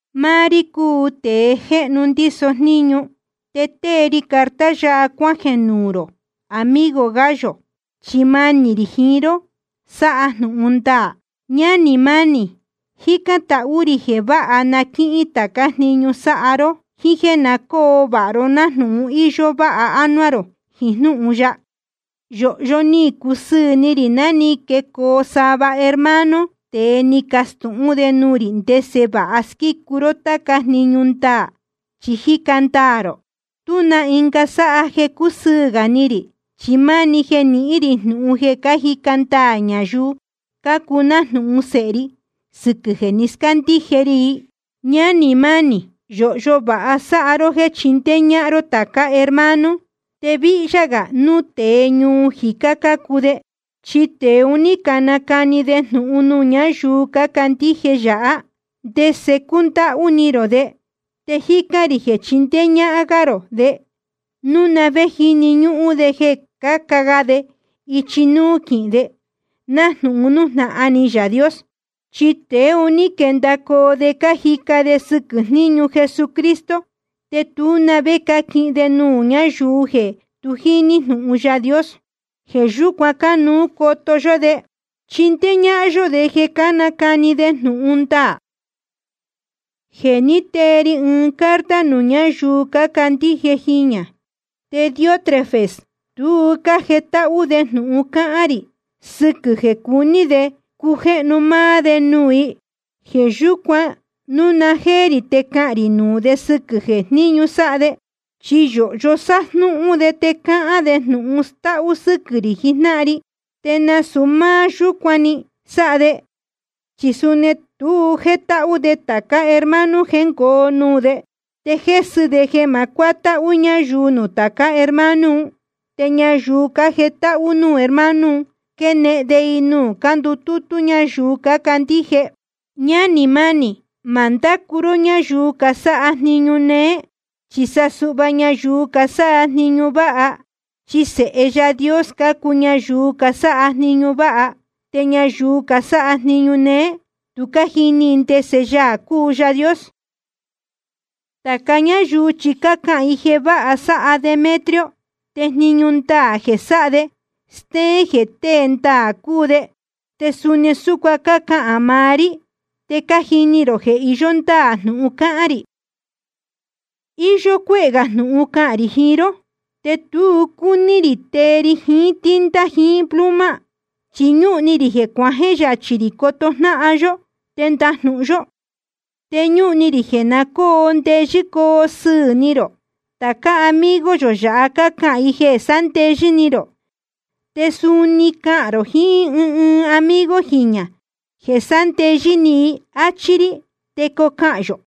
Máá rí cúu tēe jéhnu ndíso jníñu, te tée ri carta yáha cuájeē nuū rō, amigo Gayo, chi manī rī jiín ró sáha jnūhun ndaā. Ñánī mánī, jícán tahú rī jeē vāha na quíhín tācá jniñu sáha ró, jíín jéē na cóo vāha ró, nájnūhun íyó váha ánuá rō jiín jnúhun ya. Yōhyo ni cusɨɨ̄ ni rī ná ni quecoo sava hermano te ni cacastūhún de nuū rī ndese vāha squícu ró táca jniñu ndaā, chi jíca ndaā rō. Tuá na ɨnga sáha jeē cúsɨɨ̄ gā ni rī, chi máni jeē nihín rī jnūhun jeē cájica ndaā ñayuu cácuu nájnūhun sēhe ri sɨquɨ̄ jeē ni scándíje ri i. Ñánī mánī, yōhyo vāha sáha ró jéē chindéé ñáhán ró tācá hermano, te víhyá gā núu tēe ñuu jicá cácuu de. Chi tēe un ní canacani de jnūhun nuū ñáyuu cácandíje yāhá, ndese cúndáhú ni rō de. Te jícán rī jeē chindéé ñáhán gá rō de, núu na vé jíni ñúhún de jeē caca ga de ichi nuū quihín de, nájnūhun nújnahan ni Yaā Dios. Chi tēe un ní quendacoo de cájica de sɨquɨ̄ jníñu Jesucristo. Te tú na vé cáquihin de nuū ñáyuu jeē tu jíní jnūhun Yaā Dios. Jeē yúcuan cánuú coto yó de, chindéé ñáhán yó de jeē cánacani de jnūhun ndaā. Je ni tee ri ɨɨn carta nuū ñáyuu cácandíje jiñā. Te Diótrefes, tu jétáhú de jnūhun cáhán rī, sɨquɨ̄ jeē cuní de cujéhnu máá de nuū i. Jeē yúcuan, núu na jéé rī te cahān rī nuū de sɨquɨ̄ jníñu sáha de, chi yōhyo sájnúhún de te cáhán de jnūhun stáhú sɨ́quɨ̄ rī jijnáhan ri. Te nasūu máá yúcuan‑ni sáha de, chi suni tu jétáhú de tācá hermano jéngoo nuū de, te jésɨ de jeē ma cuátáhú ñáyuu nuū tācá hermano un. Te ñayuu cájetáhú nuū hermano un, quénehen de i nuū cándutútú ñayuu cácandíje. Ñánī mánī, ma ndácu ró ñáyuu casáha jniñu néé, chi sa suhva ñayuu casáha jniñu váha. Chi sēhe Yaā Dios cácuu ñayuu casáha jniñu váha. Te ñayuu casáha jniñu néé, tu cájini i ndese Yaā cúu Yaā Dios. Tāca ñáyuu chi cácahān i jeē vāha sáha Demetrio. Te jniñu ndaā jeē sáha de, stéén jeē tée ndaā cúu de. Te suni súcuan cácahān maá rí, te cájini rō jeē iyó ndáā jnūhun cáhán rī. Iyó cuéhē gā jnūhun cahān rī jiín ró, te tu cúní rī tee ri jiín tinta jiín pluma. Chi ñúhun ni rī cuajeē yachī rī coto jnáhan yó, te ndajnūhun yó. Te ñúhun ni rī jeē na cóo ndeyɨ́ coo sɨɨ̄ ni rō. Tācá amigo yō yāha cácahān i jeē sándeyɨ́ ni rō. Te suni cahān rō jiín ɨɨn ɨɨn amigo jiñā jeē sándeyɨ́ ni i, áchí rí, te cocahān yō.